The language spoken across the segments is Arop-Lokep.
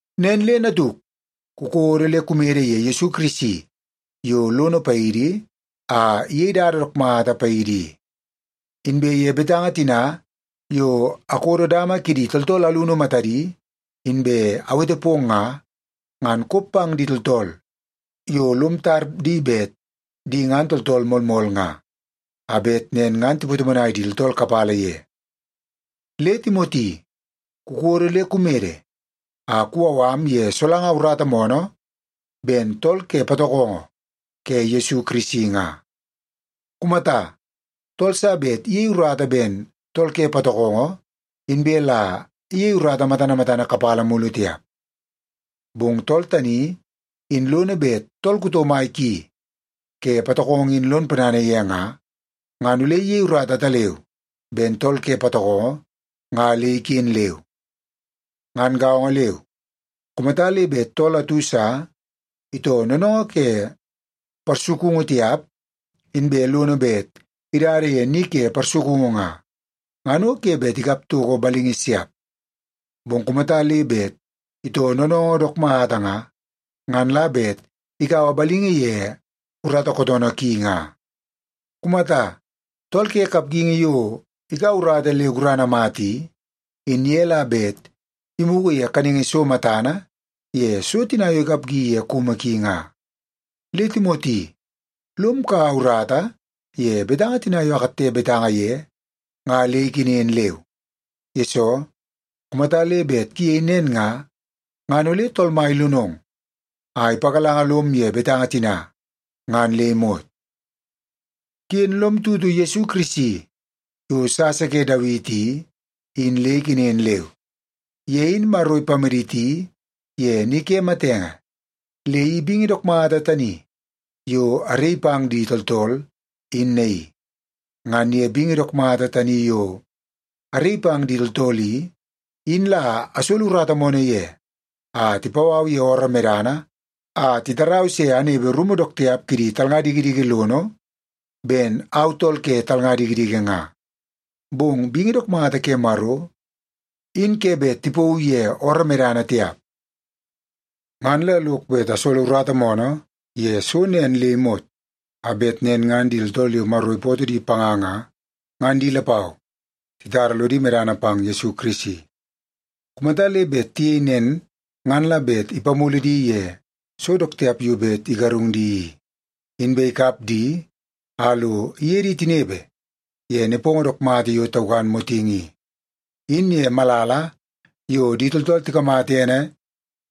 Nen le natuk, kukodo le kumede ye Yesu Kirisi yo lono paidi a iyei dada dook mata paidi i. Inbe ye betanga tina yo akodo dama kidi tooltool alunu matadi inbe awete pong nga, ngan kop pang di tooltool yo lom tar di bet di ngan tooltool moolmool nga, a bet nen ngan tipatomonai di tooltool kapala ye. Le Timoti, kukodo le kumede a kuwau am ye solanga urata moonoo ben tool ke patokongo ke Yesu Kirisi nga. Kumata, tool sa bet iyei urata ben tool ke patokongo inbe la iyei urata matana matana kapala mulu tiap. Bong tool tani in lono bet tool kuto mai ki ke patokongo in lon ponana ye nga, ngan ole iyei urata ataleu ben tool ke patokongo nga le iken leu. Ngan gaongo leu, kumata le bet tool atu sa itoo noonoongoo ke parsukungu tiap inbe lono bet idada ye ni ke parsukungu nga, ngan o ke bet ikap toko balingi siap. Bong kumata le bet itoo noonoongoo dook mata nga, ngan la bet ikaua balingi ye urata kootoonoo ki nga. Kumata, tool ke kapgingi yo ikaua urata le gurana mata i, in ye la bet imugu ye kaningi so matana ye so tina yo ikapgi ye kumu ki nga. Le Timoti, lom kaua urata ye betanga tina yo akatte betanga ye nga le ikenen leu. Yesoo, kumata le bet kuyei nen nga, ngan ole Tool Mai ilonong a ipagalanga lom ye betanga tina ngan le imot. Ken lom tutu Yesu Kirisi yo sasa ke Dawiti i, in le ikenen leu. Ye in Maro ipamaditi ye ni ke matenge, le i bingi dook mata tani yo araii pang di tooltool in naii. Ngan ye bingi dook mata tani yo araii pang di tooltool i, in la asolo urata moonoo ye a tipau au ye ooroo medana a titarau se anepe rumu dook tiap kidi talnga dikidiki lono ben au tool ke talnga dikidiki nga. Bong bingi dook mata ke Maro, in ke bet tipauu ye ooroo medana tiap. Ngan la lok bet asolo urata moonoo ye so nen le imot a bet nen ngan di tooltool yo Maro ipootoo di panga nga, ngan di lapau titara lodi medana pang Yesu Kirisi. Kumata le bet tiyei nen ngan la bet ipamulu di ye so dook tiap yo bet igarung di i, inbe ikap di a lo iye di tinepe ye nepongo dook mata yo taukan motingi i, in ye malala yo di tooltool tikamata ene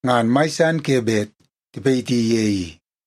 ngan mai san ke bet tipayiti ye i.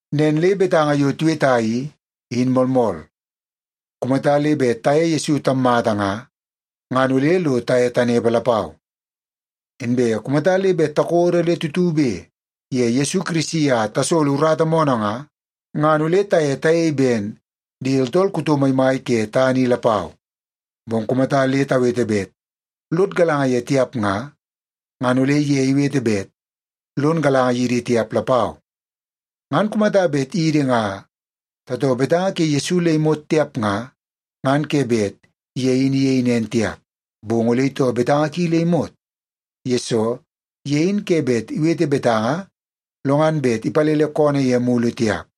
Nen le betanga yo tiweta i, in moolmool. Kumata le bet taye Yesu tammata nga, ngan ole lo taye tanepe lapau. Inbe kumata le bet takodo le tutube ye Yesu Kirisi a tasolo urata moonoo nga, ngan ole taye tayei ben di tooltool kuto maimai ke tana i lapau. Bong kumata le tawete bet lod galanga ye tiap nga, ngan ole ye iwete bet lon galanga yidi tiap lapau. Ngan kumata bet idi nga tatoo betanga ke Yesu le imot tiap nga, ngan ke bet ye in iyei nen tiap. Bong ole itoo betanga ki le imot, yesoo ye in ke bet iwete betanga lo ngan bet ipalele koonoo ye mulu tiap.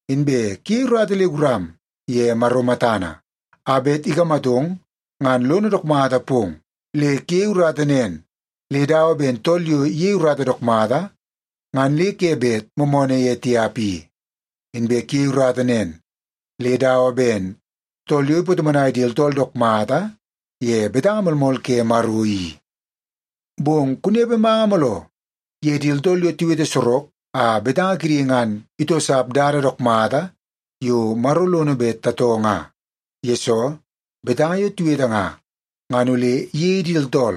Inbe kuyei urata le guram ye Maro matana a bet ikamatong ngan lono dook mata pong. Le kuyei urata nen le dawa ben tool yo iyei urata dook mata ngan le ke bet moomoonoo ye tiap i. Inbe kuyei urata nen le dawa ben tool yo ipatomonai di tooltool dook mata ye betanga moolmool ke Maro i. Bong kunepe manga mooloo ye di tooltool yo tiwete sorok a betanga kidi ngan itoosap dada dook mata yo Maro lono bet tatoo nga. Yesoo, betanga yo tiwete nga, ngan ole iyei di tooltool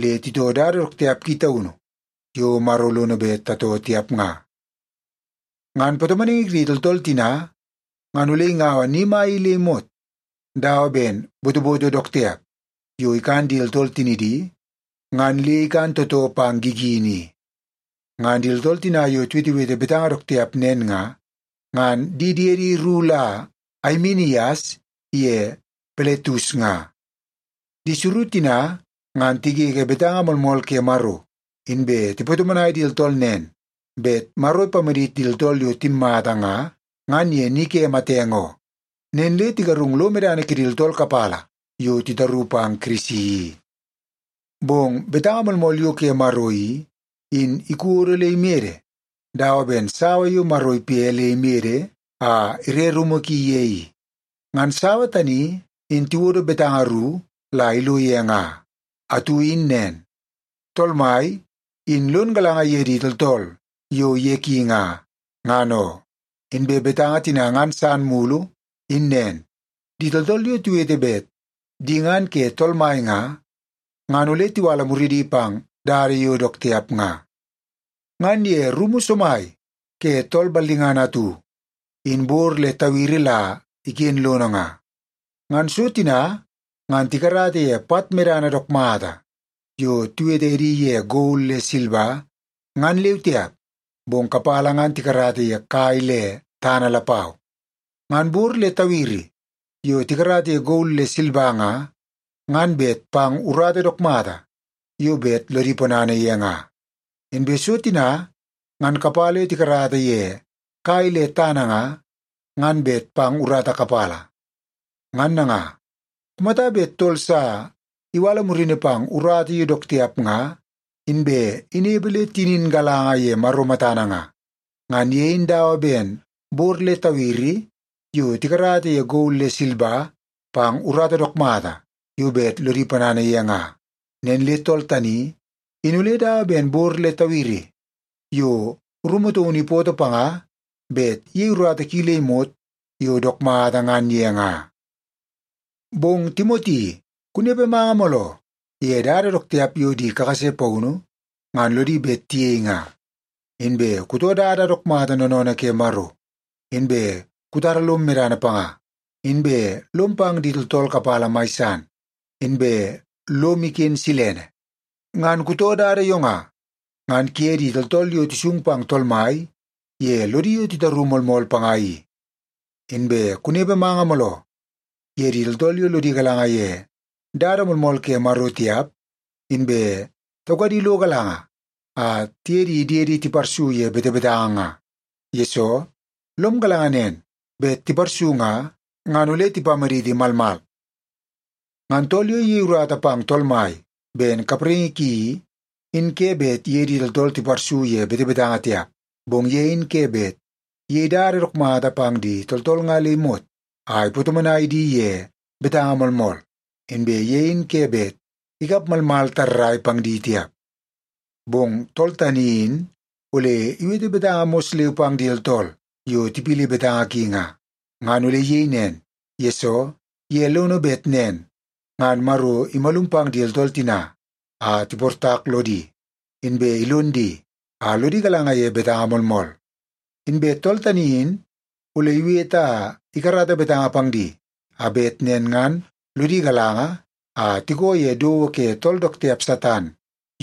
le titoo dada dook tiap ki taunu yo Maro lono bet tatoo tiap nga. Ngan patomonaingi kidi tooltool tina ngan ole ingaua ni mai le imot dawa ben botoboto dook tiap yo ikan di tooltool tinidi, ngan le ikan tootoo pang gigini i. Ngan di tooltool tina yo tiwetewete betanga dook tiap nen nga, ngan di diedi ru la Aimenias ye Piletus nga. Di suru tina ngan tigege betanga moolmool ke Maro, inbe tipatomonai di tooltool nen bet Maro ipamadit di tooltool yo timmata nga, ngan ye ni ke matenge oo. Nen le tigarungu lo medana kidi tooltool kapala yo titaru pang Kirisi i. Bong betanga moolmool yo ke Maro i, in ikodo le imede dawa ben sawa yo Maro ipe le imede a ire rumu ki ye i. Ngan sawa tani in tiwodo betanga ru la ilo ye nga. Atu in nen, “Tool Mai in lon galanga ye di tooltool yo ye ki nga, ngan oo.” Inbe betanga tina ngan san mulu in nen, “Di tooltool yo tiwete bet di ngan ke Tool Mai nga, ngan ole tiwala muridi pang dada yo dook tiap nga.” Ngan ye rumu somai ke tool ballingana atu, in bor le tawiri la iken lono nga. Ngan so tina ngan tikarata ye pat medana dook mata yo tiwete edi ye gol le silba ngan leu tiap, bong kapala ngan tikarata ye kai le tana lapau. Ngan bor le tawiri yo tikarata ye gol le silba nga, ngan bet pang urata dook mata yo bet lodi ponana ye nga. Inbe so tina ngan kapala yo tikarata ye kai le tana nga, ngan bet pang urata kapala. Ngan nanga, kumata bet tool sa iwala murini pang urata yo dook tiap nga, inbe inepe le tinin galanga ye Maro matana nga, ngan ye in dawa ben bor le tawiri yo tikarata ye gol le silba pang urata dook mata yo bet lodi ponana ye nga. Nen le tool tani in ole dawa ben bor le tawiri yo rumu taunu ipootoo panga bet iyei urata ki le imot yo dook mata ngan ye nga. Bong Timoti, kunepe manga mooloo ye dada dook tiap yo di kakase paunu ngan lodi bet tiyei nga. Inbe kutoo dada dook mata noonoonoo ke Maro, inbe kutara lom medana panga, inbe lom pang di tooltool kapala mai san, inbe lom iken silene. Ngan kutoo dada yo nga, ngan kuye di tooltool yo tisung pang Tool Mai ye lodi yo titaru moolmool panga i. Inbe kunepe manga mooloo ye di tooltool yo lodi galanga ye dada moolmool ke Maro tiap inbe taukadi lo galanga a tiye di diedi tiparsu ye betebetanga nga. Yesoo, lom galanga nen bet tiparsu nga, ngan ole tipamaditi malmal. Ngan tool yo iyei urata pang Tool Mai ben kapraingi ki i, in ke bet iye di tooltool tiparsu ye betebetanga tiap. Bong ye in ke bet iyei dada dook mata pang di tooltool nga le imot a ipatomonai di ye betanga moolmool. Inbe ye in ke bet ikap malmal tarrai pang di tiap. Bong tool tani in ole iwete betanga mos leu pang di tooltool yo tipili betanga ki nga. Ngan ole iyei nen, yesoo ye lono bet nen ngan Maro imalum pang di tooltool tina a tiportak lodi, inbe ilon di a lodi galanga ye betanga moolmool. Inbe tool tani in ole iwete a ikarata betanga pang di a bet nen ngan lodi galanga a tikoo ye dowo ke tool dook tiap Satan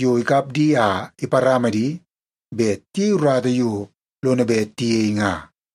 yo ikap di a iparama di bet tiyei urata yo lono bet tiyei nga.